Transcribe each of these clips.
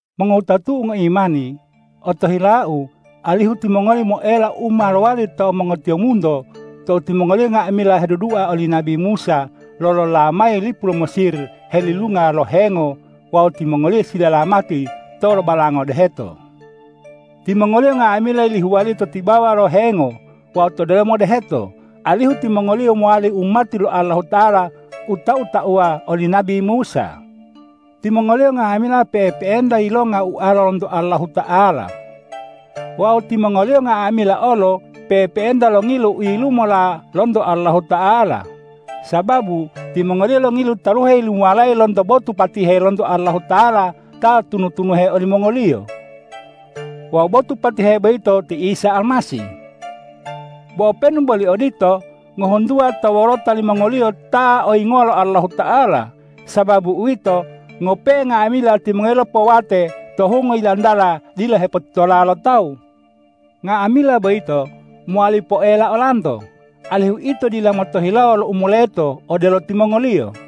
Mongowutatu'u ngoimani, otohilau alihu timongoli moela u ma lowali to mongotiyombunto tou timongoliyo nga'amila hedudua oli nabi Musa lolola mayi lipu lo Mesir helilunga lo hengo wawu timongoliyo silalamati tou lobalanga to deheto. Timongoliyo nga'amila yilihuwaliyo to tibawa lo hengo wawu to delomo deheto, alihu timongoliyo mowali umati lo Allahuta'ala u tau-tauwa oli nabi Musa. Timongoliyo nga'amila pe'epe'enta yilonga ualo lonto Allahuta'ala wawu timongoliyo nga'amila olo pe'epe'enta longilu u yilumola lonto Allahuta'ala, sababu timongoliyo longilu taluhe yilumuwalayi lonto botu patihe lonto Allahuta'ala ta tunu-tunuhe olimongoliyo. Wawu botu patihe boyito ti Isa Almasih. Bo openu boli odito, ngohuntuwa to wolota limongoliyo ta oyingowa lo Allahuta'ala. Sababu uwito, ngope'e nga'amila timongoliyo lopowate to hungo yilantala dila hepotitola lo tawu. Nga'amila boyito mowali poela olanto, alihu ito dila motohilawo lo u moleto odelo timongoliyo.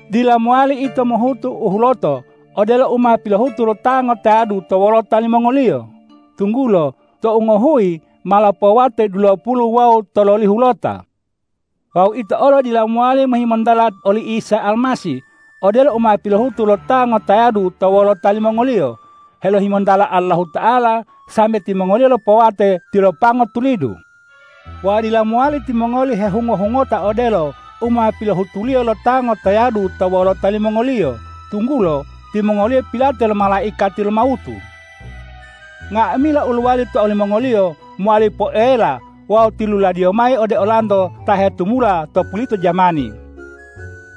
Dila mowali ito mohutu u huloto odelo u ma pilohutu lo ta ngotayadu to wolota limongoliyo, tunggulo tou ngohuyi ma lopowate dulopulu wawu tololihulota. Wawu ito olo dila mowali mohimontala oli Isa Almasih odelo u ma pilohutu lo ta ngotayadu to wolota limongoliyo helohimontala Allahuta'ala sambe timongoliyo lopowate tilopango tulidu. Wawu dila mowali timongoli hehungo-hehungota odelo u ma pilohutuliyo lo ta ngotayadu to wolota limongoliyo, tunggulo timongoliyo pilate lo malaikati lo mawutu. Nga'amila u lowali to olimongoliyo mowali poela wawu tiluladiyo mayi ode olanto ta hetumula to pulito jamani.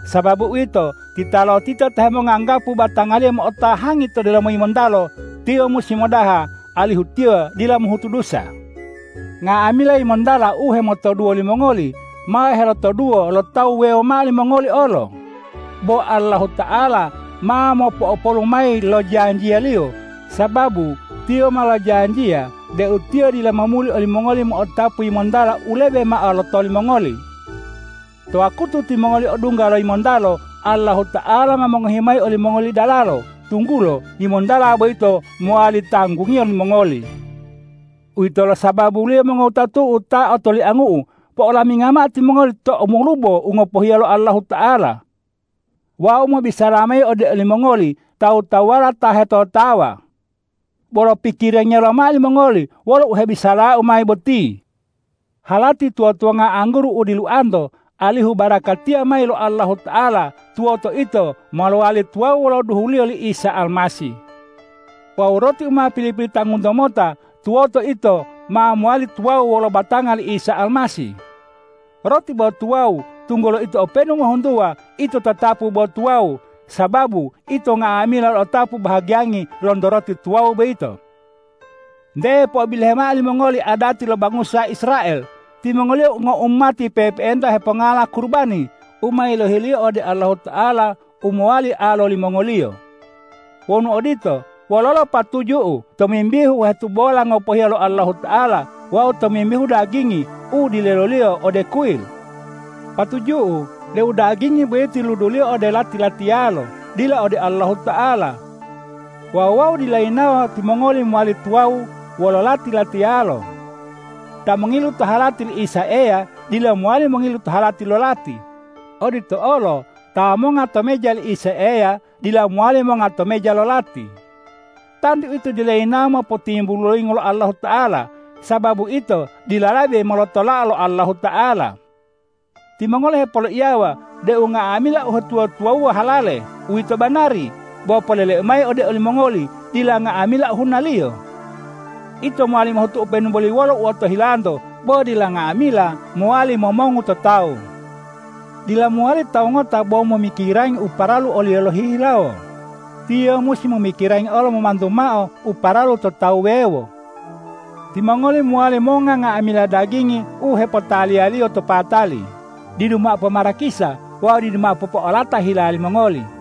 Sababu uwito, titalotita ta hemonganggapu batangaliyo mo'otahangi to delomo yimontalo, tiyo musi modaha, alihu tiyo dila mohutu dusa. Nga'amila yimontala u hemotoduwo limongoli ma helotoduwo lo tawu wuwewo mao limongoli olo. Bo Allahuta'ala ma mopo'opolu mayi lo janjiya-Liyo, sababu Tiyo ma lojanjiya deu Tiyo dila momuli olimongoli mo'otapu yimontala u lebe mao lo lotoli mongoli. To wakutu timongoli odungga lo yimontalo, Allahuta'ala ma mongohi mayi olimongoli dalalo, tunggulo yimontala boyito mowali tanggungiyo limongoli. Uwitolo sababuliyo mongowutatu'u ta otoliangu'u, po'olamingao timongoli to umolubo u ngopohiya lo Allahuta'ala! Wau mobisala mayi ode olimongoli tawu-tawuwala ta hetotawa. Bolo pikirangiya lomao limongoli wolo u hebisalau mayi boti! Halati tuwa-tuwanga angguru u diluanto alihu barakatiya mayi lo Allahuta'ala tuwoto ito ma lowali tuwawu wolo duhuliyo li Isa Almasih. Wawu roti u ma pili-pilitangunto mota tuwoto ito ma lowali tuwawu wolo batanga li Isa Almasih. Roti bo tuwawu, tunggulo ito openu ngohuntuwa ito tatapu bo tuwawu, sababu ito nga'amila lo'otapu bahagiyangi lonto roti tuwawu boyito. Nte po'obilohe mao limongoli adati lo bangusa Israel. Timongoliyo ngoumati pe'epe'enta hepongala kurubani u ma yilohiliyo ode Allahuta'ala u mowali alo limongoliyo. Wonu odito, wololo patuju'u tomimbihu u hetubola ngopohiya lo Allahuta'ala wawu tomimbihu dagingi u dileloliyo ode kuyil? Patuju'u deu dagingi boyito yiluduliyo ode lati-latiyalo, dila ode Allahuta'ala. Wawu wau dila yinawo timongoli mowali tuwawu wolo lati-latiyalo. Ta mongilu to halati li Isa Eya dila mowali mongilu to halati lo lati. Odito olo ta monga to meja Isa Eya dila mowali monga to meja lo lati. Tantu ito dila yinawo mopotimbulu loyingo lo Allahuta'ala, sababu ito dila lebe molotolao lo Allahuta'ala. Timongoli hepoloiyawa deu nga'amila uhetuwa-tuwawuwa halale. Uwito banari, bo poleleu mayi ode olimongoli: Dila nga'amila ohunaliyo. Ito mowali mohutu openu boli wolo u otohilanto, bo dila nga'amila mowali momongu to tawu. Dila mowali tawu ngota bo momikirangi u paralu oliyo lohihilawo; tiyo musi momikirangi olo momantu mao u paralu to tawu wuwewo. Timongoli mowali monga nga'amila dagingi u hepotaliyaliyo to patali didu mao pomarakisa wawu didu mao popoalata hila limongoli.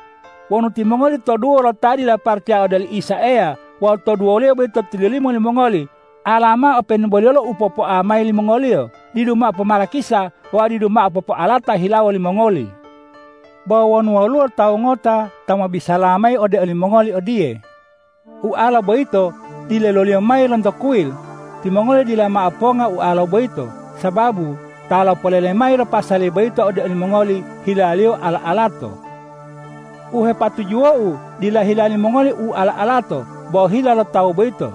Wonu timongoli toduwo lo ta dila paracaya ode oli Isa Eya wawu toduwoliyo boyito tilolimo limongoli, alamao openu boli wolo u popoaliyo mayi olimongoli didu mao pomarakisa wawu didu mao popoalata hilawo limongoli. Bo wonu woluwo tawu ngota ta mobisala mayi ode olimongoli odiye,”Ualo boyito dileloliyo mayi lonto kuyil,” timongoli dila mao ponga ualo boyito, sababu ta lopolele mayi lo pasali boyito ode olimongoli hilaliyo ala-alato. U hepatujuwou dila hila limongoli u ala-alato, bo hila lo tawu boyito.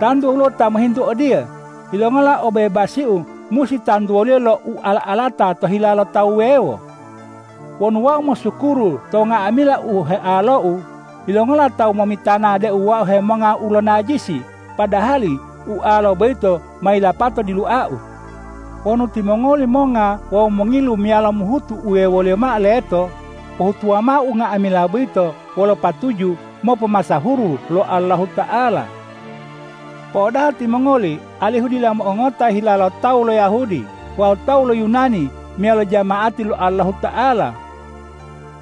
Tantu woluwo ta mohintu odiye,”Yilongola obebasiu musi tantuwoliyo lo u ala-alata to hila lo tawu wuwewo? Wonu wau mosukuru to nga'amila u healou, yilongola tawu momitana deu wau hemonga ualo najisi, padahali ualola boyito ma yilapato diluau?” Wonu timongoli monga wawu mongilu meyalo mohutu uwewoliyo mao leto, pohutuwa mao unga'amila boyito wolo patuju mopomasahuru lo Allahuta'ala. Po'odaha timongoli alihu dila mo'ongongota hila lo tawu lo Yahudi wawu tawu lo Yunani meyalo jama'ati lo Allahuta'ala.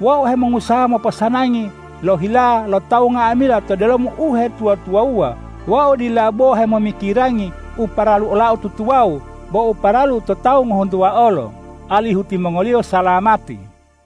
Wau hemongusaha moposanangi lo hila lo tawu nga'amila to delomo uhetuwa-tuwawuwa. Wau dila bo hemomikirangi u paralu olau tutuwawu bo u paralu to tawu ngohuntuwa olo, alihu timongoliyo salamati.